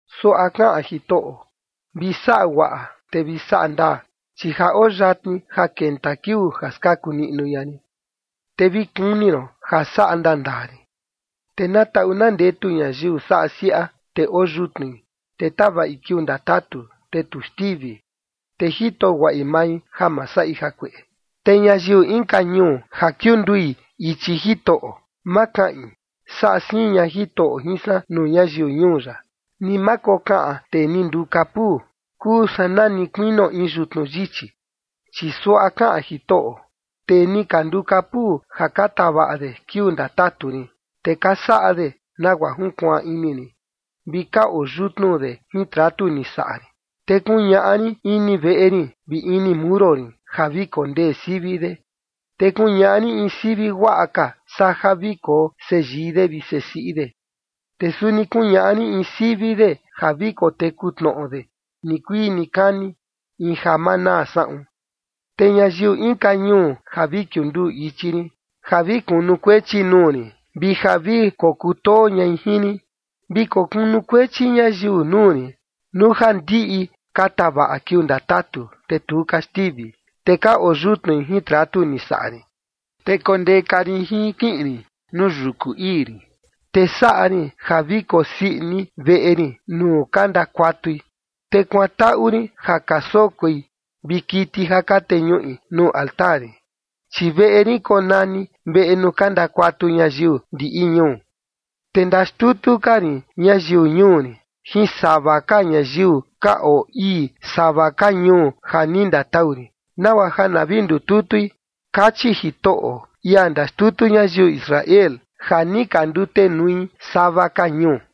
Suaꞌa kaꞌan Jitoꞌo: “Vi saꞌa guaꞌa te vi saꞌa ndaa, chi ja oo yatni ja kenta kiuu ja skaku niꞌnu ña rin, te vi kuni ron ja saꞌa ndaa ndaa rin”. Te na taꞌu na ndetu ñayiu saꞌa siaꞌa, te oo yutnui, te tavaꞌi kiuu ndatatu, te tu xtivi, te jito guaꞌi mai ja ma saꞌi jakueꞌe. Te ñayiu inka ñuu ja kiundui ichi Jitoꞌo, ma kaꞌin: “Saꞌa siin ña Jitoꞌo jin san nuu ñayiu ñuu ya”. Ni ma kokaꞌan tee ni nduu kapuu: “Kuu san nani kuinio in yutnu yichi”. Chi suaꞌa kaꞌan Jitoꞌo: “Tee ni ka nduu kapuu ja ka tavaꞌa de kiuu ndatatu rin, te ka saꞌa de nagua junkuaan ini rin, vi ka oo yutnu de jin tratu ni saꞌa rin, te kuñaꞌa rin ini veꞌe rin vi ini muro rin ja vi kondee sivi de, te kuñaꞌa rin in sivi guaꞌa ka saa ja vi koo seyii de vi sesiꞌi de, te suni kuñaꞌa rin in sivi de ja vi koteku tnoꞌo de nikuii nikani, in ja ma naa saꞌun. Te ñayiu inka ñuu ja vi kiunduu ichi rin ja vi kunukuechi nuu rin, vi ja vi kokutoo ñai jin rin, vi kokunukuechi ñayiu nuu rin, nuu ja ndiꞌi ka tavaꞌa kiuu ndatatu, te tu ka xtivi, te ka oo yutnui jin tratu ni saꞌa rin, te kondeka rin jin kiꞌin rin nuu yuku ii rin, te saꞌa rin ja vi kosii ini veꞌe rin nuu ka ndakuatui, te kuantaꞌu rin ja ka sokoi vi kiti ja ka teñuꞌi nuu altar rin, chi veꞌe rin konani veꞌe nuu ka ndakuatu ñayiu ndiꞌi ñuu. Te ndaxtutu ka rin ñayiu ñuu rin jin sava ka ñayiu ka oo ii sava ka ñuu ja ni ndatau rin, nagua ja na vi ndututui”, kachi Jitoꞌo, ia ndaxtutu ñayiu Israel ja ni ka ndutenui sava ka ñuu.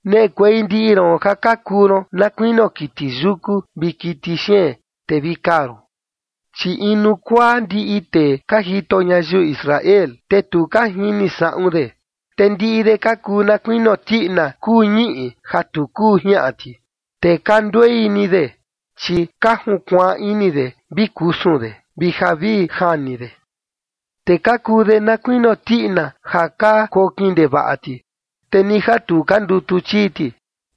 “Neꞌekuei ndiꞌi ron ja ka kuu ron na kuinio kiti yuku vi kiti xeen, te vi kaa ron. Chi inu kuaa ndiꞌi tee ka jito ñayiu Israel, te tu ka jini saꞌun de, te ndiꞌi de ka kuu na kuinio tiꞌina kuu ñiꞌi ja tu kuu jiaꞌan ti, te ka nduei ni de, chi ka junkuaan ini de vi kusun de vi ja vi jani de. Te ka kuu de na kuinio tiꞌina ja ka kokin ndevaꞌa ti, te ni ja tu ka ndutu chii ti.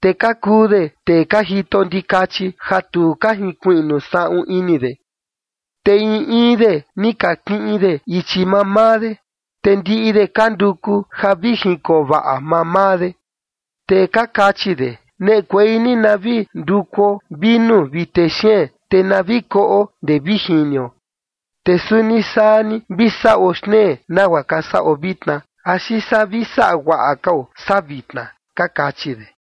Te ka kuu de tee ka jito ndikachi ja tu ka jinkuiꞌnu saꞌun ini de, te in in de ni ka kiꞌin de ichi mamaa de, te ndiꞌi de ka nduku de ja vi jinkoo vaꞌa mamaa de. Te ka kachi de: Neꞌekuei ni na vi ndukuo vinu vi texeen, te na vi koꞌo ndee vi jinio, te suni saa ni vi saꞌo xtnee nagua ka saꞌo vitna, axi saa vi saꞌa guaꞌa kao saa vitna, ka kachi de.”